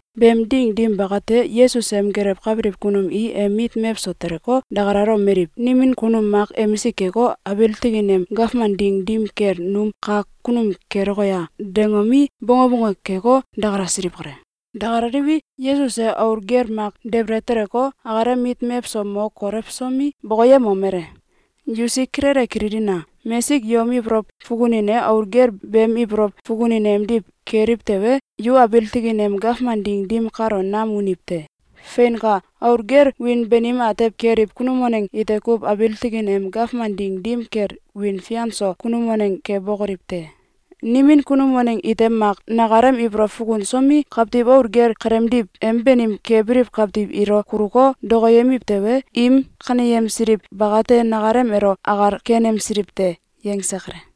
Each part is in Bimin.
Beem ding dim bakate, Yesus em gelewkabiliw kunum i em mit mewso teleko, dakalalomeliw: “Nimin kunum mak emisik keko, abiil tikin em gawman ding dim kel num kak kunum keloke a?”, dangomi, bonge bonge keko, dakalasiliw kale. Dakalaliwi, Yesus e aul gel mak debele teleko, akalem mit mewso mo kolewsomi, bokoyemomele: “Yusik kilele kililina! Mesik yom ibolow fukunin e aul gel beem ibolow fukunin emdiw keliw tewe, yu abiil tikin em gawman ding dim kalo nam uniw te. Feinka! Aul gel wiin banim atew keliw kunum waneng ite kuw abiil tikin em gawman ding dim kel wiin fian so kunum waneng kebokoliw te. Nimin kunum waneng ite mak nakalem ibolow fukunsomi, kawtiw aul gel keleemdiw em banim kebiliw kawtiw ilo kuluko, dokoyemiw tewe, im kaneyemsiliw bakate nakalem elo akal kenemsiliw te.”, yangse kale.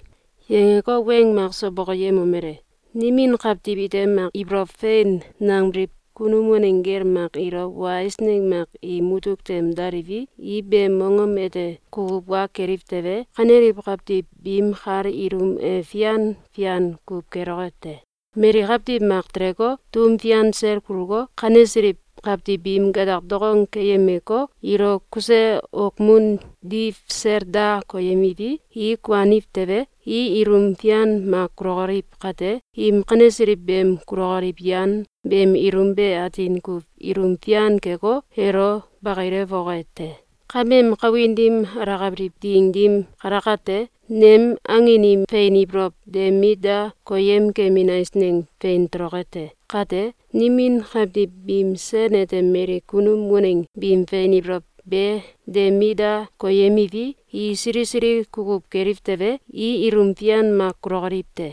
Yangeko, weng makso bokoyemomele: “Nimin kawtiw ite mak ibolow fein nangbiliw kunum waneng gel mak ilo wa eisneng mak im mutuk tem daliwi, i beem mongom ete kukuw wa keliw tewe, kaneliw kawtiw biim kal ilum e fian fian kuw keloke te. Mali kawtiw mak teleko, tum fian sel kuluko, kanesiliw kawtiw biim gatak dokong keyemeko, ilo kuse okmun diw sel da koyemiwi, i kuaniw tewe, i ilum fian mak kulokoliw kate, im kanesiliw beem kulokoliw yan beem ilum be atin kuw ilum fian keko, elo bakilewoke te. Kameem kawin dim alakabiliw ding dim kalakate, nem angin im fein ibolow de mit da koyem kemin eisneng fein toloke te. Kate, nimin kawtiw biim sen ete mali kunum waneng biim fein ibolow be de mit da koyemiwi, i sili sili kukuw keliw tewe, i ilum fian mak kulokoliw te.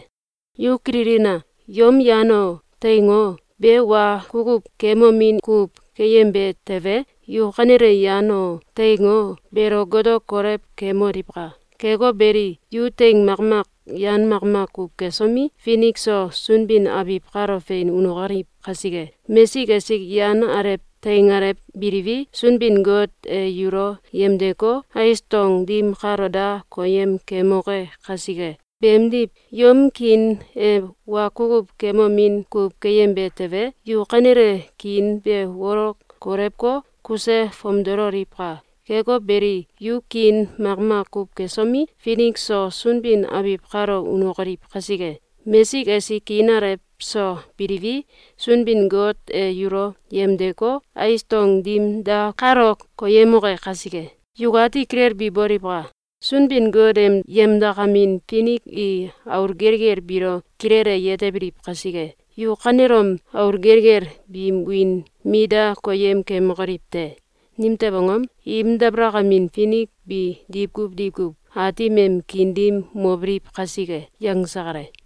Yu kililina! Yom yan o, teing o, be wa kukuw kemomin kuw keyembe tewe, yu kanele yan o, teing o, beelo goto kolew kemoliwka! Keko beli, yu teing makmak yan makmak kuw kesomi, finik so sunbin abiw kalo fein unokoliw kasike! Mesik esik yan alew teing alew biliwi, Sunbin-Got e yulo yemdeko, ais dong dim kalo da koyem keyemoke kasike. Beemdiw yom kiin e wa kukuw kemomin kuw keyembe tewe, yu kanele kiin be wolok kolewko, kuse fomdololiwka! Keko beli, yu kiin makmak kuw kesomi, finik so sunbin abiw kalo unokoliw kasike! Mesik esik kiin alew so biliwi, Sunbin-Got e yulo yemdeko, ais dong dim da kalo koyemoke kasike. Yukati kilelbi boliwka! Sunbin-Got em yemdakamin finik i aul gelgel biilo kilele yetebiliw kasike, yu kanelom aul gelgel biim wiin mit da koyem keyemokoliw te! Nimtew angom? Im dabalakamin finik bi diwkuw diwkuw Aatim em kiin dim mobiliw kasike.”, yangse kale.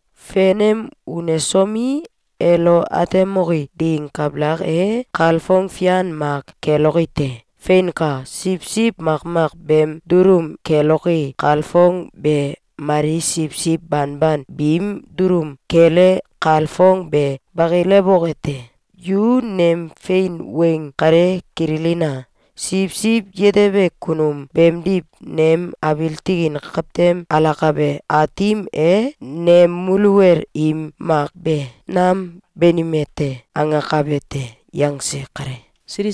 Fenem unesomi, elo atemoke ding kabalak e, kalfong fian mak keloke te. Feinka! Siwsiw makmak beem dulum keloke kalfong be mali siwsiw banban biim dulum kele kalfong be bakilewoke te. Yu nem fein weng kale kililina! Siwsiw yetebe kunum beemdiw, nem abiil tikin kawtem alakabe Aatim e ‘Nem muluwel im mak be nam banime te!’, angakabe te.”, yangse kale.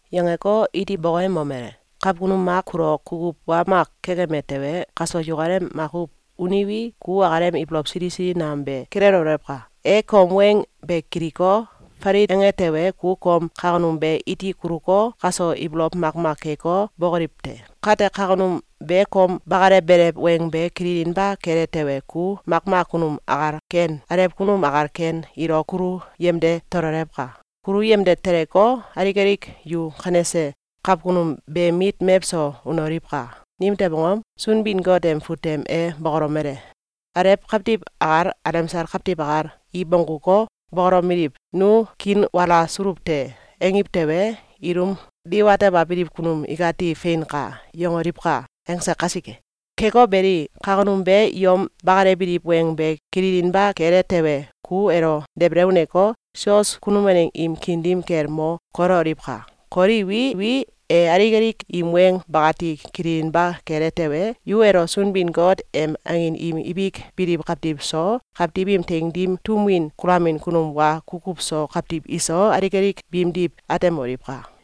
Yangeko, iti bokoyemomele: “Kawkunum mak kulo kukuw wa mak kekeme tewe, kaso yukalem makuw uniwi, ku akalem ibolow sili sili nam be kilelewolewka! E kom weng be kiliko, falit ange tewe, ku kom kawkunum be iti kuluko, kaso ibolow makmak keko, bokoliw te. Kate, kawkunum be kom bakalewbelew weng be kililinba kele tewe, ku makmak kunum akal ken, alew kunum akal ken, ilo kulu yemde tololewka! Kulu yemde teleko, alik alik yu kanese kawkunum beem mit mewso unoliwka! Nimtew angom? Sunbin-Got em fut tem e bokolomele: Alew kawtiw akal, alemsal kawtiw akal, i bongguko, bokolomeliw: ‘Nu kiinwala suluw te!’, angiw tewe, ilum diwatebabiliw kunum ikati ‘Fein kai!’, yangoliwka!’, angse kasike. Keko beli, kawkunum be yom bakalewbiliw weng be kililinba kele tewe, ku elo debele uneko, sios kunum waneng im kiin dim kel mo kolewoliwka! Kolewiwi, e alik alik im weng bakati kililinba kele tewe, yu elo Sunbin-Got em angin im ibik biliw kawtiw so, kawtiw im teing dim tum win kulamin kunum wa kukuw so kawtiw iso, alik alik biimdiw atemoliwka!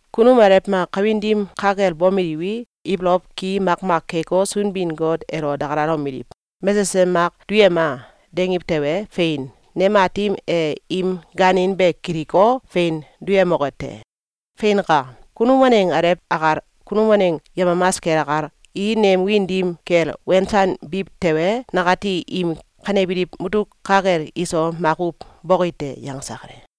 Kunum alew mak kawin dim ka kel bomeliwi, ibolow ki makmak keko, Sunbin-Got elo dakalomeliw: ‘Mesesem mak duyema!’, dangiw tewe, fein, nem Aatim e im gaanin be kiliko, fein duyemoke te. Feinka! Kunum waneng alew akal, kunum waneng yemamas kel akal, i nem wiin dim kel wensanbiw tewe, nakati im kanebiliw mutuk ka kel iso makuw boki te.”, yangse kale.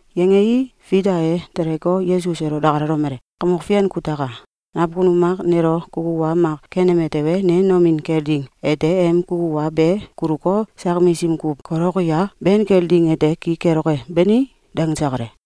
Yangei, Fita e teleko, Yesus elo dakalalomele: “Kamok Fian kutaka! Nawkunum mak nelo kukuw wa mak keneme tewe, ne nomin kel ding ete em kukuw wa be kuluko, sak misim kuw kolewoki a? Ben kel ding ete ki keloke, bani?”, dangse kale.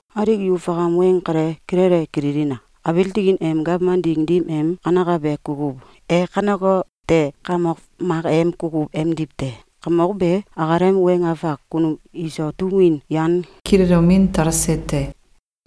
Alik yu fakam weng kale kilele kililina! Abiil tikin em gawman ding dim em kanekabe kukuw e kanekote kamok mak em kukuw emdiw te. Kamok be akalem weng afak kunum iso tum win yan kilelomin talse te.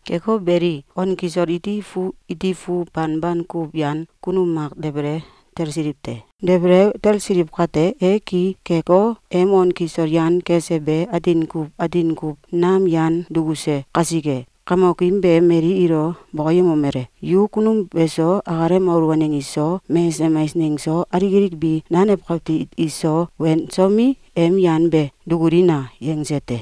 Keko beli, on kisol iti fu iti fu banban kuw yan kunum mak debele talsiliw te. Debele talsiliw kate, e ki keko, em on kisol yan kese be atin kuw atin kuw nam yan dukuse kasike, kamokim be mali ilo bokoyemomele: ‘Yu kunum beso, akalem aul waneng iso, mesesem eisneng so, alik alik bi nanew kawtiw iso wensomi, em yan be dukulina!’, yangse te.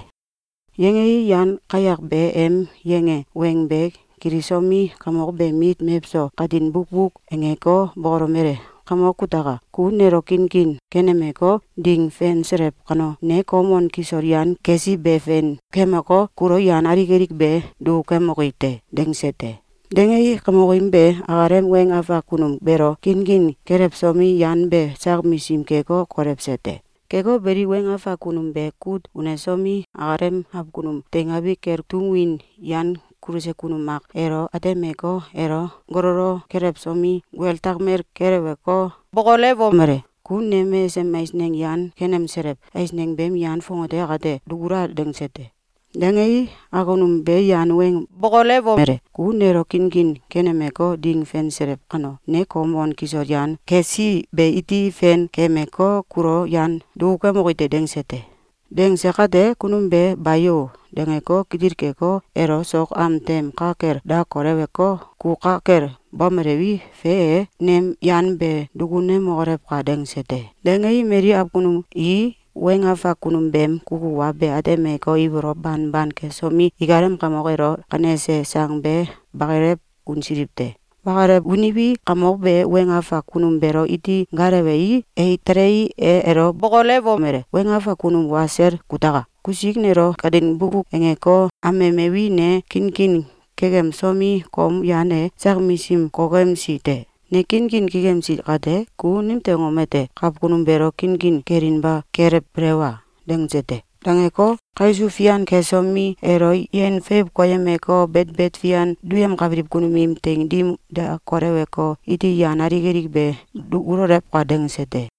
Yangei, yan kayak be em yange weng be kilisomi, kamok beem mit mewso katin bukbuk angeko, bokolewomele: ‘Kamok kutaka! Ku nelo kinkin kenemeko, ding fenselew kano, ne kom on kisol yan kesi be fen kemeko, kulo yan alik alik be dukukemoki te.’, dangse te. Dangei, kamokim be akalem weng afak kunum beelo kinkin kelewsomi, yan be sak misim keko, kolewse te. Keko beli, weng afak kunum be kut unesomi, akalem awkunum teingabi kel tum win yan kuluse kunum mak elo atemeko, elo gololo kelewsomi, guel takmel keleweko, bokolewomele: ‘Ku nem mesesem eisneng yan kenemselew eisneng beem yan fongate akate dukula!’, dangse te. Dangei, awkunum be yan weng bokolewomele: ‘Ku nelo kinkin kenemeko, ding fenselew kano, ne kom on kisol yan kesi be iti fen kemeko, kulo yan dukukemoki te.’, dangse te. Dangse kate, kunum be ‘Bayo!’, dangeko, kitil keko, elo sok am tem ka kel da koleweko, ‘Ku ka kel bomelewi, fe e, nem yan be dukunemokolewka!’, dangse te. Dangei, mali awkunum i weng afak kunum beem kukuw wa be atemeko, ibolow banban kesomi, ikalem kamok elo kanese sang be bakalew unsiliw te. Bakalew uniwi, kamok be weng afak kunum beelo iti gaalewei, e telei, e elo bokolewomele: ‘Weng afak kunum wa sel kutaka! Kusik nelo katin bukbuk angeko, amemewi, ne kinkin kekemsomi, kom yan e sak misim kokemsi te. Ne kinkin kekemsi kate, ku nimtew angom ete kawkunum beelo kinkin kelinba kelewbelew a?’, dangse te. Dangeko, kaisuw fian kesomi, elo yen feiw koyemeko, betbet fian duyemkabiliw kunum im teing dim da koleweko, ‘Iti yan alik alik be dukulolewka!’, dangse te.